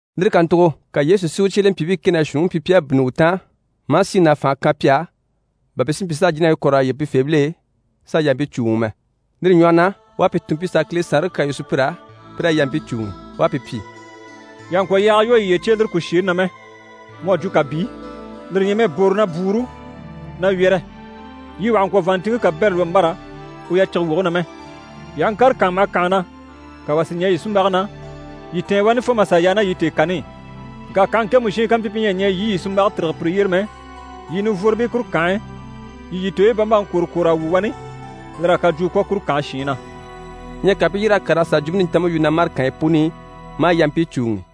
Lire kàntugo ka Yesu si u cyelempyiibii kɛ ná shuunniŋi pyi pi à bínni u taan, maa síŋi ná fànhe kan pi á, bà pi si mpyi s'a jínabii puni kɔ̀re s'a yige pifeebil'e, s'a yampii cùuŋi mɛ. Lire ɲwɔhɔ na, u à pi tun pi sà a Kile Saanre kyaa yu sùpyir'á, pi raa yampii cùuŋi. U à pi pyi: «Yii àha ŋkwɔ̀ yaaga lwɔ́ yiye cye e lire kùsheeni na mɛ, mu à jwo kàbii, lire ɲyɛ mɛ boro ná bwúuru ná wyɛ́rɛ. Yii wà hà ŋkwɔ̀ vàanntinŋke kabɛrɛ lwɔ́ mbâra u yacige woge na mɛ. Yii aha ŋkàre kànha maha kànha na, ka wà si ɲɛɛ yii sunmbage na, yii tɛ̀ɛn wani fo mà sà yaa ná yii tèekani i. Ŋka kànhe ŋkemu shiin kampyi pi ɲyɛ a ɲɛɛ yii i yii sunmbage tîrige pire yyére mɛ, yii nivworobii kuru kànhe e, yii yii tooyi bambaŋi kwòro kwòr'a wu wani, lir'à kajwuu kwɔ̀ kuru kànhe shiin na.» Ɲyɛ ka pi i yîr'a kàr'a sà a Jwumpe Nintanmpe yu na mâre kànyi puni i, maa yampii cùuŋi.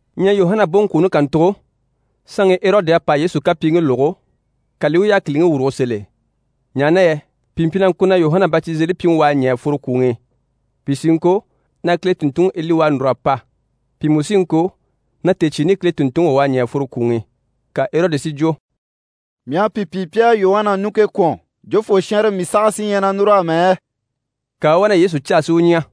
Ɲyɛ Yuhana boŋkwooni kàntugo, saanŋi Erɔdi à pa Yesu kapyiiŋkii lógo, ka li i u yákiliŋi wùrugo sèl'e, ɲaha na yɛ pìi mpyi na ŋko na Yuhana Batizelipyiŋi u à ɲɛ̀ a fworo kwùŋi i. Pìi sí i ŋko na Kile tùnntunŋi Eli u à núr'a pa, pìi mú sí i ŋko na tèecyiini Kile tùnntunŋi wà u à ɲɛ̀ a fworo kwùŋi i. Ka Erɔdi si jwo: «Mii à pi pyi pi à Yuhana ɲùŋke kwɔ̀n, jofoo shɛnrɛ mii saha sí ɲyɛ na núru amɛ yɛ?» Ka u u wá na Yesu caa si u ɲya.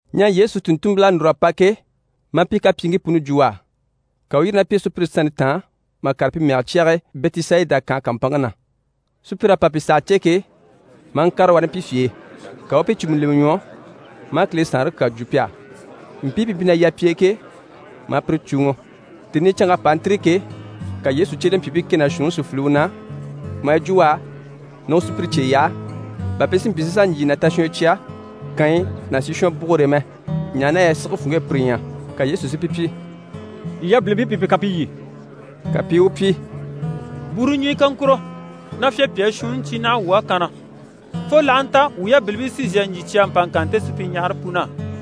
Ɲyɛ Yesu tùnntunmpil'à núr'a pa ke, maa pi kapyiiŋkii puni jwo u á, ka u u yîri ná pi e sùpyire sannte taan mà kàre pi mɛge cyage e Bɛtisayida kànhe kàmpanŋke na. Sùpyir'à pa pi saha cè ke, maa ŋkàre wani pi fye e. Ka u u pi cùmu lemɛ ɲwɔ, maa Kile Saanre kyaa jwo pi á. Mpii pi mpyi na yà pi e ke, maa pire cùuŋɔ. Tèni i canŋk'à pa a ntîri ke, ka Yesu cyelempyiibii kɛ ná shuunniŋi si file u na maa yi jwo u á na u sùpyire cye yaha, bà pi si mpyi si sà ɲjyì ná tashwɔnyɔ cya kànyi ná sishwɔnbugure e mɛ, ɲaha na yɛ sige funŋke e pire ɲyɛ. Ka Yesu si pi pyi: «Yii yabilimpii pi pi kan pi lyî.» Ka pi i u pyi: «Bwúuru ɲùnyɔ kaŋkuro ná fyapyaa shuunni cyi naha wuu á kanna, fo l'aha nta wuu yabilimpii sí n‑sà ɲjyì cya mpa ŋkan nte supyiɲyahare pun'á.»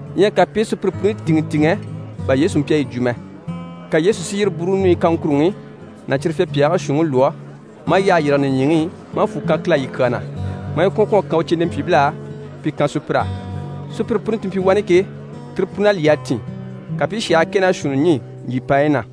Ɲyɛ ka pi i sùpyire puni tìŋɛ tìŋɛ, bà Yesu mpyi a yi jwo mɛ. Ka Yesu si yire bwúuru ɲùɲyi kaŋkuruŋi ná cyire fyapyaagii shuunniŋi lwɔ́, maa yyahe yîrige nìɲyiŋi i, maa fwù kan Kile á yi kyaa na, maa yi kwɔ̀n kwɔ̀n a kan u cyelempyiibil'á, pi kan sùpyir'á. Sùpyire puni ti mpyi wani ke, tire pun'à lyî a tìn. Ka pi i shàhii kɛ ná shuunni ɲî ɲjyìpaanyi na.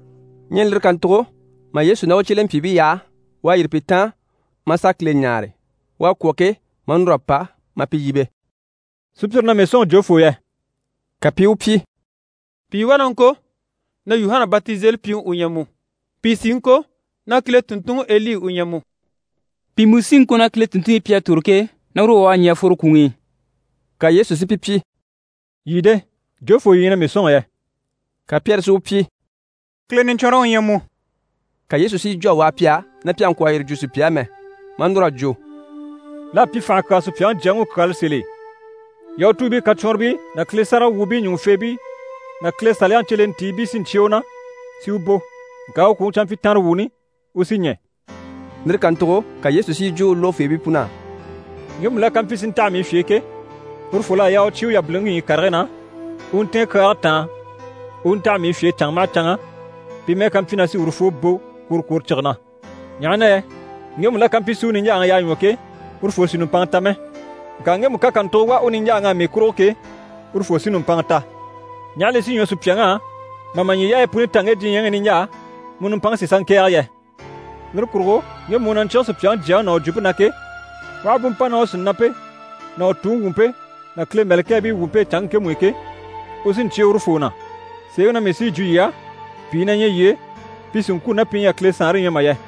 Ɲyɛ lire kàntugo, mà Yesu ná u cyelempyiibii yaha, u à yîri pi taan, maa sà Kile ɲáare. U à kwɔ̀ ke, maa núr'a pa, maa pi yíbe: «Sùpyire na mii sɔ̂nŋi jofoo yɛ?» Ka pi i u pyi: «Pìi wá na ŋko na Yuhana Batizelipyiŋi u ɲyɛ mu, pìi sí i ŋko na Kile tùnntunŋiEli u ɲyɛ mu, pìi mú sí i ŋko na Kile tùnntunmpii pi à tòro ke, na uru wà u à ɲɛ̀ a fworo kwùŋi i.» Ka Yesu si pi pyi: «Yii de? Jofoo yii ɲyɛ na mii sɔ̂nŋi yɛ?» Ka Pyɛri si u pyi: «Kile Niɲcwɔnrɔŋi u ɲyɛ mu.» Ka Yesu si yi jwo a waha pi á na pi àha ŋkwɔ̀ yire jwo sùpya á mɛ. Maa núr'a jwo: «L'à pyi fànha kyaa Supyaŋi Jyaŋi u kyaala sèl'e. Yahutuubii kacwɔnribii ná Kile sáragawwuubii ɲùŋufeebii ná Kile Saliyaŋi cyelentiibii sí n‑cyé u na, si u bò. Ŋka u kwùŋi canmpyitanrewuuni, u sí ɲɛ̀.» Lire kàntugo ka Yesu si yi jwo u lógofeebii pun'á: «Ŋgemu la ká mpyi si ntaha mii fye e ke, urufol'à yaa u cyé u yabiliŋi ɲyii karigii na, u u ntɛ̀ɛn kyaage taan u u ntaha mii fye e canŋa maha canŋa, pi mɛ́ɛ ká mpyi na sí urufoo bò kworokworocige na. Ɲaha na yɛ ŋgemu la ká mpyi si u niɲjaaŋi yaa ɲwɔ ke, urufoo sì nùmpanŋa ta mɛ, ŋka ŋgemu ká kàntugo wà u niɲjaaŋ'á mii kurugo ke, urufoo sí nùmpanŋa ta. Ɲaha li sí ɲwɔ sùpyaŋ'á mà ma ɲyii yaayi puni ta ŋge diɲyɛŋi i niɲjaa, mu nùmpanŋke si sà ŋkɛ̀ɛge yɛ? Lire kurugo ŋgemu u na ɲcyíge Supyaŋi Jyaŋi ná u jwumpe na ke, u aha bú mpa ná u sìnampe ná u Tuŋi wumpe ná Kile mɛ̀lɛkɛɛbii wumpe e canŋke ŋkemu i ke, u sí n‑cyé urufoo na. Sèeŋi na mii sí yi jwo yii á, pìi na ɲyɛ yii e, pi sì n‑kwû ná pi ɲyɛ a Kile Saanre ɲya mà yɛ!»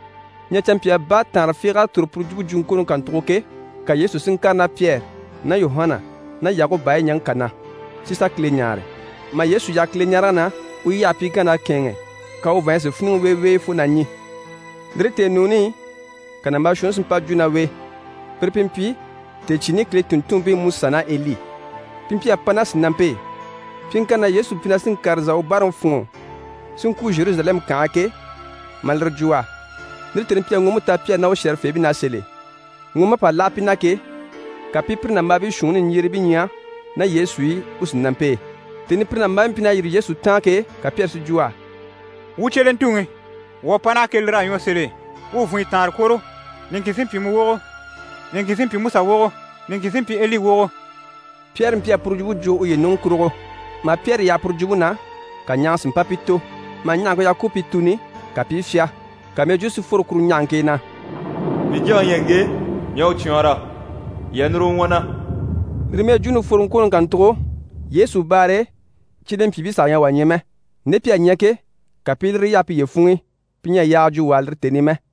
Ɲyɛ canmpyaa baataanre fiig'à tòro puru jwumpe jwuŋkwooni kàntugo ke, ka Yesu si ŋkàre ná Pyɛri ná Yuhana ná Yakuba e ɲaŋke kà na, si sà Kile ɲáare. Mà Yesu yaha Kileɲarege na, u yyahe pyiŋkann'à kɛ̂ɛnŋɛ, ka u vàanɲyi si fíniŋɛ weewee fo na ɲî. Lire tèenuuni i, ka nàmbaa shuunni si mpa jwo ná u e. Pire pi mpyi tèecyiini Kile tùnntunmpiiMusa ná Eli. Pi mpyi a pa ná sìnampe e. Pyiŋkanni na Yesu mpyi na sí n‑kàre n‑sà u báaraŋi fûnŋɔ si ŋkwû Zheruzalɛmu kànhe e ke, maa lire jwo u á. Lire tèni mpyi a ŋɔɔmpe ta Pyɛri ná u shɛ̀rɛfeebii na sèl'e. Ŋɔɔmp'à pa láha pi na ke, ka pi i pire nàmbaabii shuunniŋi niɲjyerebii ɲya ná Yesu i u sìnampe e. Tèni i pire nàmbaabii mpyi na yîri Yesu taan ke, ka Pyɛri si jwo u á: «Wuu cyelentuŋi, wuu à pa naha ke, lir'à ɲwɔ sèl'e. Wuu vùnyɔ taanre kwòro, niŋkin sí n‑pyi mu wogo, niŋkin sí n‑pyi Musa wogo, niŋkin sí n‑pyi Eli wogo.» Pyɛri mpyi a puru jwumpe jwo uye ɲùŋɔ kurugo. Mà Pyɛri yaha puru jwumpe na, ka ɲahaŋa si mpa pi tò. Mà ɲahaŋke yaha ku u pi tùni, ka pi i fyá. Ka mɛjwuu si fworo kuru ɲahaŋke e na: «Mii Jyaŋi u ɲyɛ ŋge, mii à u cwɔɔnrɔ. Yii a núru u ɲwɔ na.» Lire mɛjwuuni fworoŋkwooni kàntugo, Yesu baare e, cyelempyiibii saha ɲyɛ a wà ɲya mɛ. Nde pi à ɲya ke, ka pi i lire yaha piye funŋ'i, pi ɲyɛ a yaaga jwo wà á lire tèni i mɛ.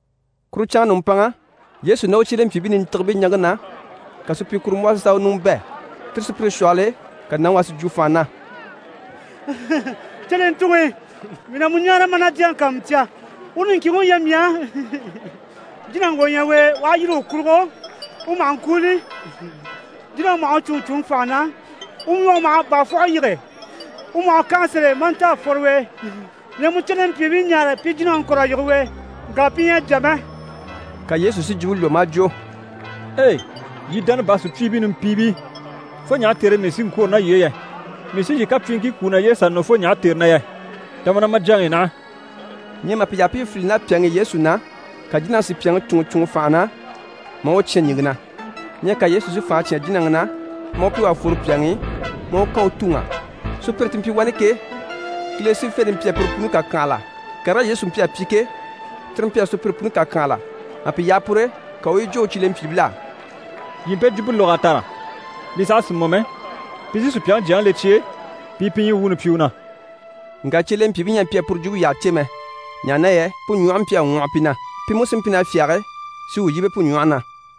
Kuru canŋa nùmpanŋa, Yesu ná u cyelempyiibii nintigibii ɲaŋke na, ka supyikurumbwɔhɔ sí sà u ɲùŋɔ bɛ̂. Tire sùpyire shwɔhɔl'e, ka nàŋi wà si jwo fànha na: «Cyelentuŋi, mii na mu ɲáare, maa na jyaŋi kàanmucya. Uru niŋkinŋi u ɲyɛ mii á. Jínaŋi wà u ɲyɛ u e, u aha yîri u kurugo, u maha ŋkwúuli, jínaŋi maha u cúnŋɔ cúnŋɔ fànha na, u ɲwɔge maha bàafwɔhe yige, u maha u kànha sèl'e, maa nta a fworo u e. Mii à mu cyelempyiibii ɲáare pi jínaŋi kɔ̀r'a yige u e, ŋka pi ɲyɛ a jà mɛ.» Ka Yesu si jwumpe lwɔ́ maa jwo: «Ei! Yii dánabaa sùpyiibii nimpiibii, fo ɲaha tère e mii sí n‑kwôro ná yii e yɛ? Mii sí yii kapyiiŋkii kwú naye e sà nɔ fo ɲaha tère na yɛ? Ta ma ná ma jyaŋi i naha.» Ɲyɛ mà pi yaha pi i filili ná pyàŋi i Yesu na, ka jínaŋi si pyàŋi cúnŋɔ cúnŋɔ fànha na maa u cyán ɲìŋke na. Ɲyɛ ka Yesu si fànha cyán jínaŋi na, maa u pyi u à fworo pyàŋi i, maa u kan u tuŋ'á. Sùpyire ti mpyi wani ke, Kile sífente mpyi a pire puni kàkyanhala. Karigii Yesu mpyi a pyi ke, cyire mpyi a sùpyire puni kàkyanhala. Mà pi yaha pur'e, ka u u yi jwo u cyelempyiibil'á: «Yii mpe jwumpe lóg'a tàra, li saha sì mɔ mɛ, pi sí Supyaŋi Jyaŋi le cye e, pi i pi ɲyii wuuni pyi u na.» Ŋka cyelempyiibii ɲyɛ a mpyi a puru jwumpe yyaha cè mɛ, ɲaha na yɛ pu ɲwɔhe mpyi a ŋwɔhɔ pi na, pi mú sí mpyi na fyáge si u yíbe pu ɲwɔhe na.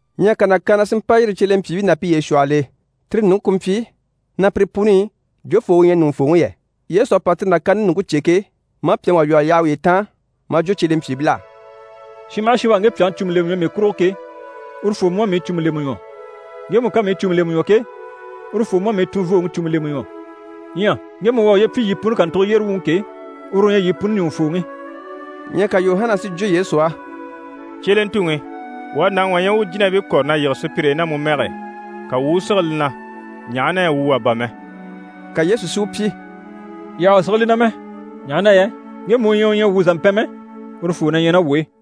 Ɲyɛ ka nàkaana si mpa yîri cyelempyiibii ná piye shwɔhɔl'e, tire ɲùŋke ku mpyi na pire puni i jofoo u ɲyɛ ɲùŋufooŋi yɛ. Yesu à pa tire nàkaante ɲùŋke cè ke, maa pyàŋi wà lwɔ́ a yaha uye taan, maa jwo cyelempyiibil'á: «Shin maha shin u à ŋge pyàŋi cùmu lemɛ ɲwɔ mii kurugo ke, urufoo mú à mii cùmu lemɛ ɲwɔ. Ŋgemu ká mii cùmu lemɛ ɲwɔ ke, urufoo mú à mii tunvooŋi cùmu lemɛ ɲwɔ. Ɲyɛ ŋgemu u à uye pyi yii puni kàntugo yyére wuŋi ke, uru u ɲyɛ yii puni ɲùŋufooŋi.» Ɲyɛ ka Yuhana si jwo Yesu á: «Cyelentuŋi, wuu à nàŋi wà ɲya u u jínabii kɔ̀re na yige sùpyire e ná mu mɛge e, ka wuu u u sige li na, ɲaha na yɛ wuu wà bà mɛ.» Ka Yesu si u pyi: «Yii àha u sige li na mɛ, ɲaha na yɛ ŋgemu u ɲyɛ u ɲyɛ wuu zàmpɛn mɛ, urufoo na ɲyɛ ná wuu e.»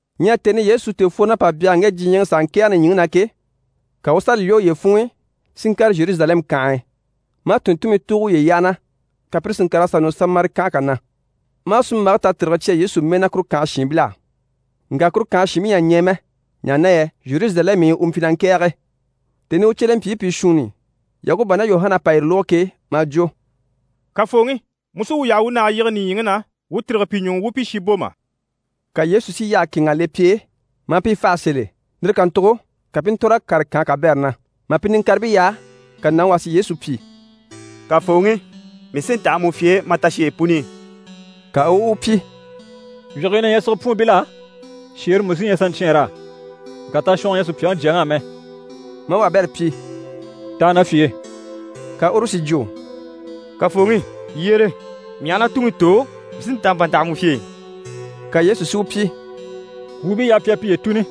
Ɲyɛ tèni i Yesu tèefworon'à pa byanhara ŋge diɲyɛŋi i, s'a ŋkɛ̀ɛge nìɲyiŋi na ke, ka u u sàa li lwɔ́ uye funŋ'i si ŋkàre Zheruzalɛmu kànhe e, maa tùnntunmii tùugo uye yyaha na, ka pire si ŋkàr'a sà nɔ Samari kànhe kà na, maa sunmbage tatirige cya Yesu mɛɛ na kuru kànhe shiinbil'á. Ŋka kuru kànhe shiinbii ɲyɛ a ɲɛɛ mɛ, ɲaha na yɛ Zheruzalɛmu i u mpyi na ŋkɛ̀ɛge. Tèni i u cyelempyiibii pìi shuunni Yakuba ná Yuhana à pa yire lógo ke, maa jwo: «Kafooŋi, mu sí wuu yaha wuu nage yige nìɲyiŋi na wuu tîrige pi ɲuŋ'i wuu u pi shi bò mà?» Ka Yesu si yyaha kɛ̂ɛnŋ'a le pi e maa pi faha sèl'e. Lire kàntugo ka pi i ntòr'a kàre kànhe kabɛrɛ na. Mà pi niŋkaribii yaha, ka nàŋi wà si Yesu pyi: «Kafooŋi, mii sí n‑taha mu fye e ma tasheyi puni i.» Ka u u u pyi: «Wyigii na ɲyɛ sigepwuunbil'á, shèere mú sí ɲyɛ saɲcyɛɛnr'á. Ŋka tashwɔngɔ ɲyɛ Supyaŋi Jyaŋi á mɛ.» Maa wabɛrɛ pyi: «Taha na fye e.» Ka uru si jwo: «Kafooŋi, yyére, mii aha na tuŋi tò, mii sí n‑ta n‑pa n‑taha mu fye e.» Ka Yesu si u pyi: «Kwùubii yaha pi a piye tùni,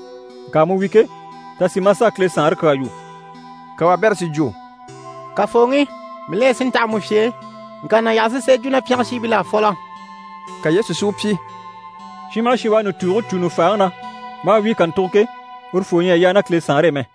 ŋka mu wi ke, ta sì maa sà a Kile Saanre kyaa yu.» Ka wabɛrɛ si jwo: «Kafooŋi, mii la ɲyɛ si ntaha mu fye e, ŋka na yaha si sà yi jwo na pyɛngɛ shiinbil'á fɔlɔ.» Ka Yesu si u pyi: «Shin maha shin u à nùtuuge cû nùfaaŋi na, maa wíi kàntugo ke, urufoo ɲyɛ a yaa ná Kile Saanre e mɛ.»